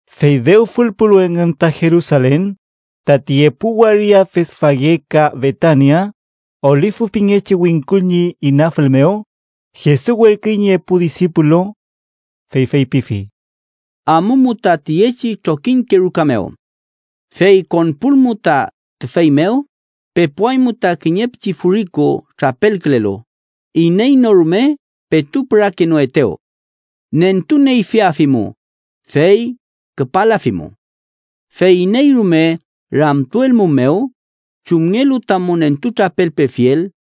Fey dew fülpulu engün ta Jerusalen, tati epu waria Betfage ka Betania, Olifu pingechi wingkul ñi inafül mew, Jesus werküy ñi epu disipulu. Fey feypifi: —Amumu ta tiyechi trokiñke ruka mew. Fey konpulmu ta tüfey mew, pepuaymu ta kiñe pichi furiku trapelkülelu, iney no rume petu pürakenoetew. Nentuneyfiafimu, fey küpalafimu. Fey iney rume ramtuelmumew chumngelu tamu nentutrapelpefiel,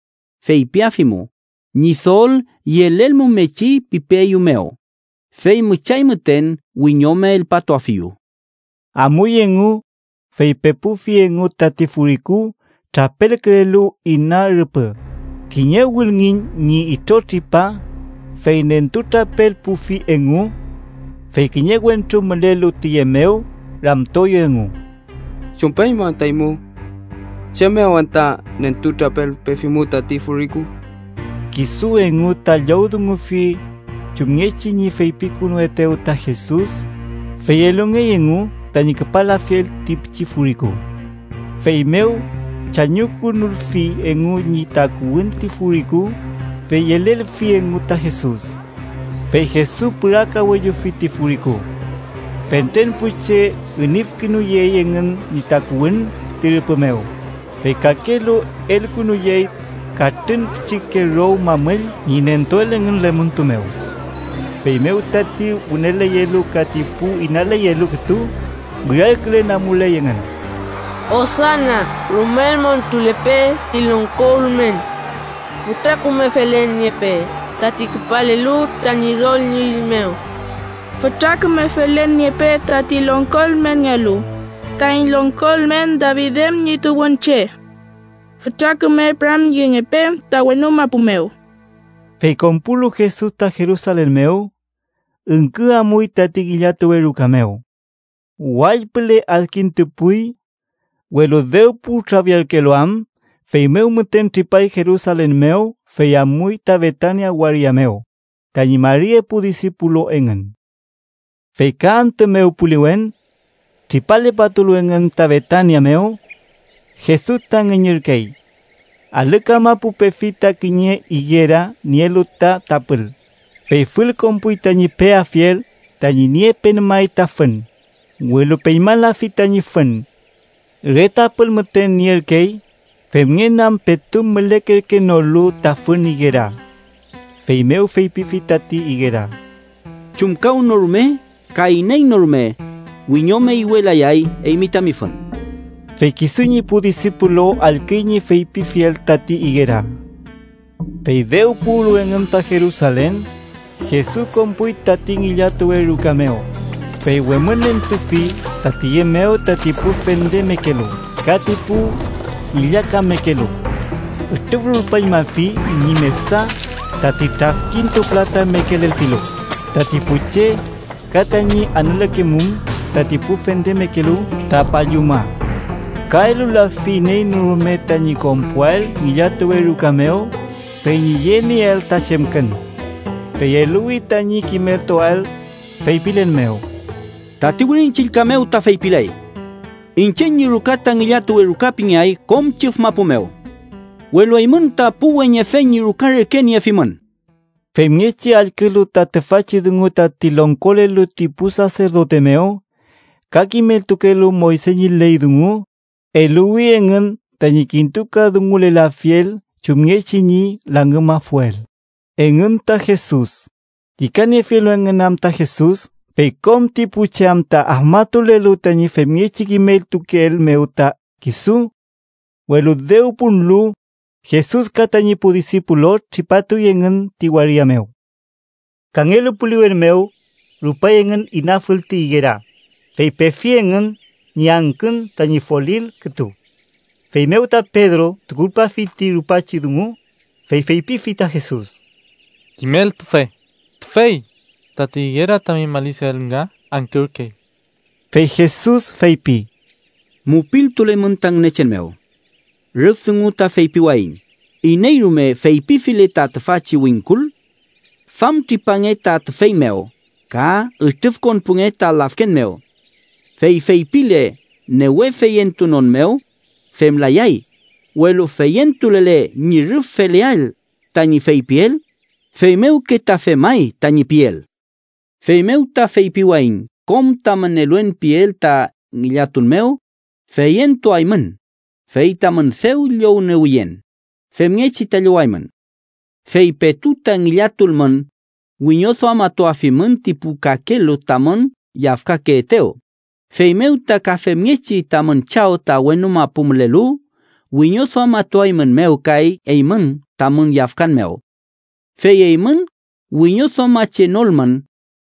feypiafimu ‘Ñidol yelelmumechi pipeeyumew’, fey müchay müten wiñome elpatuafiyu. Amuy engu, fey pepufi engu tati furiku trapelkülelu ina rüpü, kiñe wülngiñ ñi itrotripa, fey nentutrapelpufi engu. Fey kiñe wentru mülelu tiye mew ramtueyew engu: —¿Chumpeymu anta eymu? ¿Chem mew anta nentutrapelpefimu tati furiku? Kisu engu ta llowdungufi chumngechi ñi feypikünuetew ta Jesus, fey elungey engu tañi küpalafiel ti pichi furiku. Feymew chañukünulfi engu ñi takuwün ti furiku, fey yelelfi engu ta Jesus. Fey Jesus pürakawellufi ti furiku. Fentren pu che inüfkünuyey engün ñi takuwün ti rüpü mew, fey kakelu elkünuyey katrün pichike row mamüll ñi nentuel engün lemuntu mew. Feymew tati wüneleyelu ka ti pu inaleyelu kütu, wirarkülen amuley engün: “¡Osana! ¡Rumel montulepe ti longko ülmen! ¡Fütra küme felen niepe tati küpalelu ta Ñidol ñi üy mew! ¡Fütra küme felen niepe tati longko ülmenngealu, taiñ longko ülmen David em ñi tuwünche! ¡Fütra küme püramyengepe ta wenu mapu mew!” Fey konpulu Jesus ta Jerusalen mew, üngkü amuy tati ngillatuwe ruka mew. Wall püle adkintupuy, welu dew putrafiarkelu am feymew müten tripay Jerusalen mew fey amuy ta Betania waria mew tañi mari epu disipulu engün. Fey ka antü mew puliwen, tripalepatulu engün ta Betania mew Jesus ta ngüñürkey. Alü kamapu pefi ta kiñe igera nielu ta tapül, fey fülkonpuy tañi peafiel tañi niepen may ta fün, welu peñmalafi tañi fün. Re tapül müten nierkey, femngen am petu mülekerkenolu ta fün igera. Feymew feypifi tati igera: —¡Chumkawnorume ka iney no rume wiñome iwelayay eymi tami fün! Fey kisu ñi pu disipulu allküy ñi feypifiel tati igera. Fey dew puwlu engün ta Jerusalen, Jesus konpuy tati ngillatuwe ruka mew, fey wemünentufi ta tiye mew tati pu fendemekelu ka ti pu ngillakamekelu. Ütrüfrulpañmafi ñi mesa tati trafkintupülatamekelelfilu tati pu che, ka tañi anülekemum tati pu fendekelu ta palluma. Ka elulafi iney no rume tañi konpuael ngillatuwe ruka mew fey ñi yenieael ta chemkün. Fey eluwi tañi kimeltuael, feypilen mew: “Tati Wirin Chillka mew ta feypiley: ‘Iñche ñi ruka ta ngillatuwe ruka pingeay kom chüf mapu mew’, welu eymün ta pu weñefe ñi ruka reke niefimün.” Femngechi allkülu ta tüfachi dungu tati longkolelu ti pu saserdote mew ka ti kimeltukelu Moyse ñi ley dungu, eluwi engün tañi kintukadungulelafiel chumngechi ñi langümafuel engün ta Jesus, llükaniefilu engün am ta Jesus, fey kom ti pu che am ta afmatulelu tañi femngechi kimeltukeel mew ta kisu. Welu dew punlu, Jesus ka tañi pu disipulu tripatuy engün ti waria mew. Kangelu puliwen mew, rupay engün inafül tati igera, fey pefi engün ñi angkün tañi folil kütu. Feymew ta Pedro, tukulpafi ti rupachi dungu, fey feypifi ta Jesus: —Kimeltufe, tüfey, tati igera tami malisiael nga angkürkey. Fey Jesus feypi: —Mupiltulemün ta Ngünechen mew. Rüf dungu ta feypiwayiñ iney rume feypifile ta tüfachi wingkul: ‘¡Famtripange ta tüfey mew ka ütrüfkonpunge ta lafken mew’! fey feypile newe feyentunon mew, femlayay, welu feyentulele ñi rüf feleael tañi feypiel, feymewke ta femay tañi piel. Feymew ta feypiwayiñ kom tamün eluen piel ta ngillatun mew, feyentuaymün fey tamün dew llowniewiyen, femngechi ta llowaymün. Fey petu ta ngillatulmün, wiñoduamatuafimün ti pu kakelu tamün yafkakeetew, feymew ta ka femngechi tamün Chaw ta wenu mapu mülelu wiñoduamatuaeymünmew kay eymün tamün yafkan mew. Fey eymün wiñoduamachenolmün,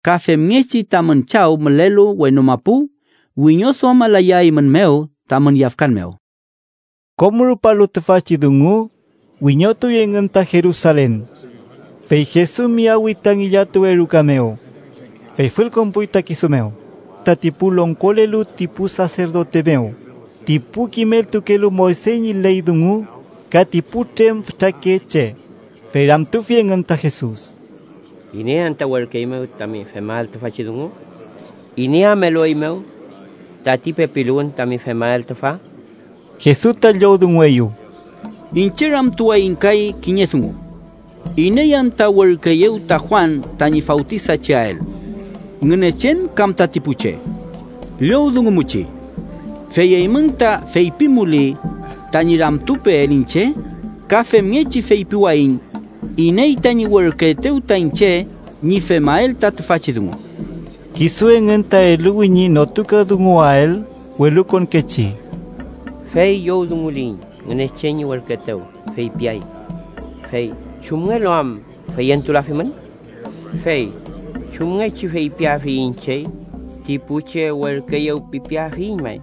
ka femngechi tamün Chaw mülelu wenu mapu wiñoduamalayaeymünmew tamün yafkan mew. Kom rupalu tüfachi dungu, wiñotuy engün ta Jerusalen. Fey Jesus miyawi ta ngillatuwe ruka mew, fey fülkonpuy ta kisu mew tati pu longkolelu ti pu saserdote mew, ti pu kimeltukelu Moyse ñi ley dungu ka ti putrem fütakeche, fey ramtufi engün ta Jesus: —¿Iney anta werküeymew tami femael tüfachi dungu? ¿Iney am elueymew tati pepiluwün tami femael tüfa? Jesus ta llowdungueyew: —Iñche ramtuwayiñ kay kiñe dungu: ¿Iney anta werküeyew ta Juan tañi fawtisacheael? ¿Ngünechen kam tati pu che? Llowdungumuchi. Fey eymün ta feypimuli tañi ramtupeel iñche, ka femngechi feypiwayiñ iney tañi werküetew ta iñche ñi femael ta tüfachi dungu. Kisu engün ta eluwi ñi notukadunguwael welukonkechi: “Fey llowdunguliyiñ ‘Ngünechen ñi werküetew’, feypiay: ‘Fey ¿chumngelu am feyentulafimün?’ ¿Fey chumngechi feypiafuiñ chey ‘ti pu che werküeyew pipeafiyiñ may?...’”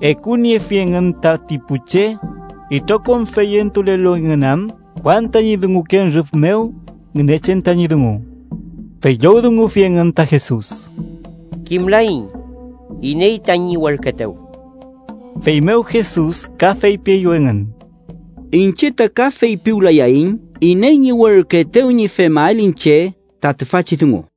(Ekuniefi engün tati pu che, itrokom feyentulelu engün am Juan tañi dunguken rüf mew Ngünechen tañi dungu.) Fey llowdungufi engün ta Jesus: —Kimlaiñ iney tañi werküetew. Feymew Jesus ka feypieyew engün: —Iñche ta ka feypiwlayayiñ iney ñi werküetew ñi femael iñche ta tüfachi dungu.